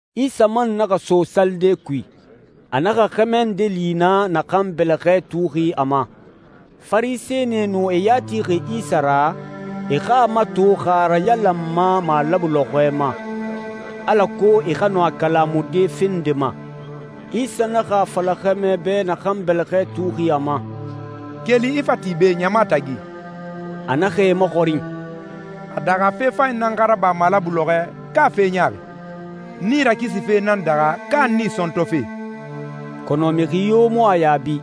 Isa man naxa so salide kui. A naxa xɛmɛ nde li naa, naxan bɛlɛxɛ tuuxi a ma. Farisɛnie nu e ya tixi Isa ra e xa a mato xa a a rayalanma malabu lɔxɔɛ ma, alako e xa nɔ a kalamude fe nde ma. Isa naxa a fala xɛmɛ bɛ naxan bɛlɛxɛ tuuxi a ma, «Keli, i fa ti be, ɲama tagi.» A naxa e maxɔrin, «A daxa fe fanyi nan xa raba malabu lɔxɔɛ, ka fe ɲaaxi? Nii rakisife nan daxa ka nii sɔntɔfe?» Kɔnɔ mixi yo mu a yaabi.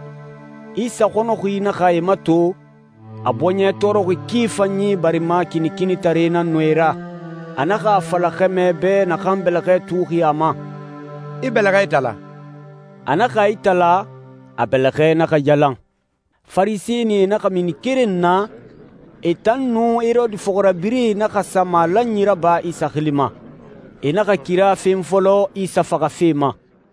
Isa xɔnɔxi naxa e mato, a bɔɲɛ tɔɔrɔxi ki fanyi barima kinikinitare nan nu e ra. A naxa a fala xɛmɛ bɛ naxan bɛlɛxɛ tuuxi a ma, «I bɛlɛxɛ itala.» A naxa a itala, a bɛlɛxɛ naxa yalan. Farisɛnie naxa mini keren na, e tan nun Herode fɔxirabirɛe naxa sa malanyi raba Isa xili ma. E naxa kira fen fɔlɔ Isa faxafe ma.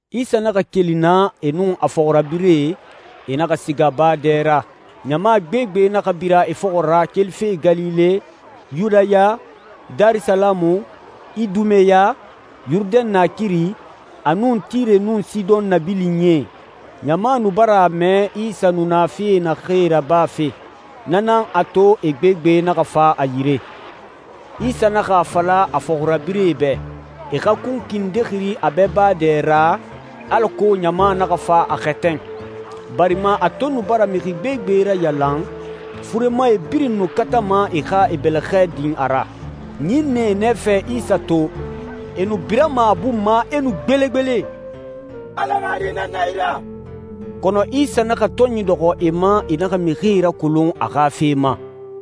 Isa naxa keli naa e nun a fɔxirabirɛe, e naxa siga baa dɛ ra. Ɲama gbegbe naxa bira e fɔxɔ ra kelife Galile, Yudaya, Darisalamu, Idumeya, Yurudɛn naakiri, a nun Tire nun Sidɔn nabilinyie. Ɲama nu bara a mɛ Isa nu na fee naxee rabafe. Na nan a to e gbegbe naxa fa a yire. Isa naxa a fala a fɔxirabirɛe bɛ, e xa kunkui nde xiri a bɛ baa dɛ ra, alako ɲama naxa fa a xɛtɛn. Barima a to nu bara mixi gbegbe rayalan, furemae birin nu katama e xa e bɛlɛxɛ din a ra. Ɲinnɛe nɛfɛ Isa to, e nu birama a bun ma, e nu gbelegbele, «Ala xa Di nan na i ra.» Kɔnɔ Isa naxa tɔnyi dɔxɔ e ma e naxa mixie rakolon a xa fe ma.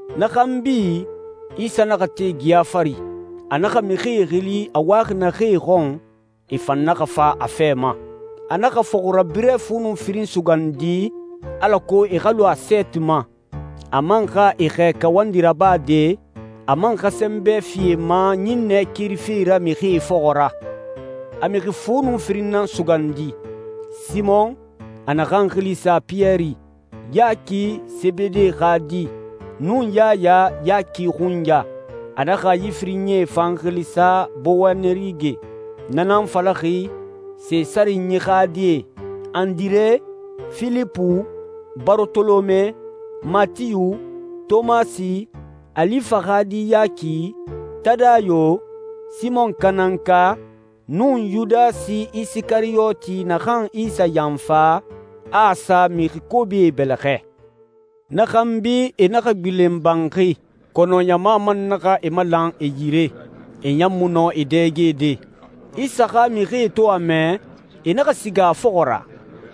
Na xanbi, Isa naxa te geya fari. A naxa mixie xili a waxi naxee xɔn, e fan naxa fa a fɛ ma. A naxa fɔxirabirɛ fu nun firin sugandi, alako e xa lu a sɛɛti ma, a man xa e xɛɛ kawandi rabade, a man xa sɛnbɛ fi e ma ɲinnɛ kerife ra mixie fɔxɔ ra. A mixi fu nun firin nan sugandi: Simɔn, a naxan xili sa Piyɛri, Yaki, Sebede xa di, nun Yaya, Yaki xunya, (a naxa yi firinyie fan xili sa Bowanerige, na nan falaxi «sesarinyi xa die»), Andire, Filipu, Barotolome, Matiyu, Tomasi, Alifa xa di Yaki, Tadayo, Simɔn Kanaanka, nun Yudasi Isikariyoti naxan Isa yanfa, a a sa mixi kobie bɛlɛxɛ. Na xanbi, e naxa gbilen banxi, kɔnɔ ɲama man naxa e malan e yire. E ɲan mu nɔ e dɛgede. Isa xa mixie to a mɛ, e naxa siga a fɔxɔ ra,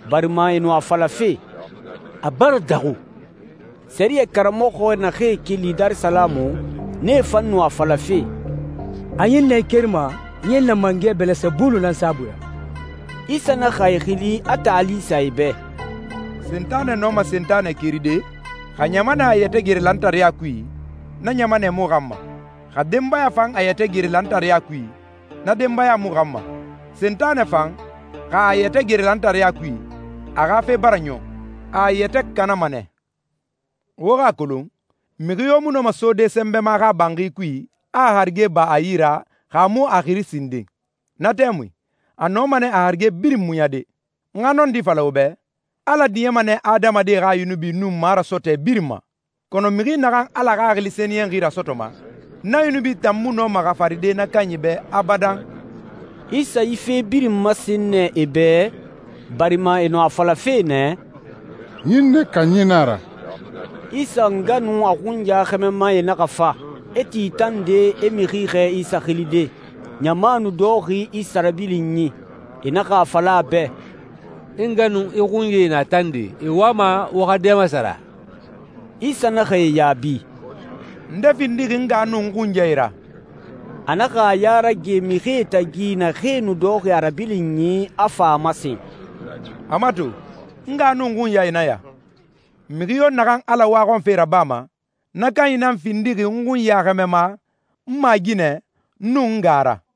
barima e nu a falafe, «A bara daxu.» Sɛriyɛ karamɔxɔ naxee keli Darisalamu, nee fan nu a falafe, «A ɲinnɛe kerima ɲinnɛ mangɛ Bɛlɛsɛbulu nan saabui ra.» Isa naxa e xili, a taali sa e bɛ, «Sentanɛ nɔma Sentanɛ keride? Xa ɲamanɛ a yɛtɛ gere lantareya kui, na ɲamanɛ mu xanma. Xa denbaya fan a yɛtɛ gere lantareya kui, na denbaya mu xanma. Sentanɛ fan, xa a a yɛtɛ gere lantareya kui, a xa fe bara ɲɔn, a a yɛtɛ kanama nɛ. Wo xa a kolon, mixi yo mu nɔma sode sɛnbɛma xa banxi kui, a a harige ba a yi ra, xa a mu a xiri sinden. Na tɛmui, a nɔma nɛ a harige birin muɲade.» «N xa nɔndi fala wo bɛ, Ala diɲɛma nɛ adamadie xa yunubi nun marasɔtɔɛ birin ma, kɔnɔ mixi naxan Ala Xaxili Sɛniyɛnxi rasɔtɔma, na yunubi tan mu nɔma xafaride na kanyi bɛ abadan.» Isa yi fe birin masen nɛ e bɛ, barima e nu a falafe nɛ, «Ɲinnɛ kanyi na a ra.» Isa nga nun a xunya xɛmɛmae naxa fa, e ti tande, e mixi xɛɛ Isa xilide. Ɲama nu dɔxɔxi Isa rabilinyi. E naxa a fala a bɛ, «I nga nun i xunyae na tande, e wama wo xa dɛ masara.» Isa naxa e yaabi, «Nde findixi n nga nun n xunyae ra?» A naxa a ya rage mixie tagi naxee nu dɔxɔxi a rabilinyi, a fa a masen, «A mato, n nga nun n xunyae nan ya. Mixi yo naxan Ala waxɔnfe rabama, na kanyi nan findixi n xunya xɛmɛma, n maaginɛ, nun n nga ra.»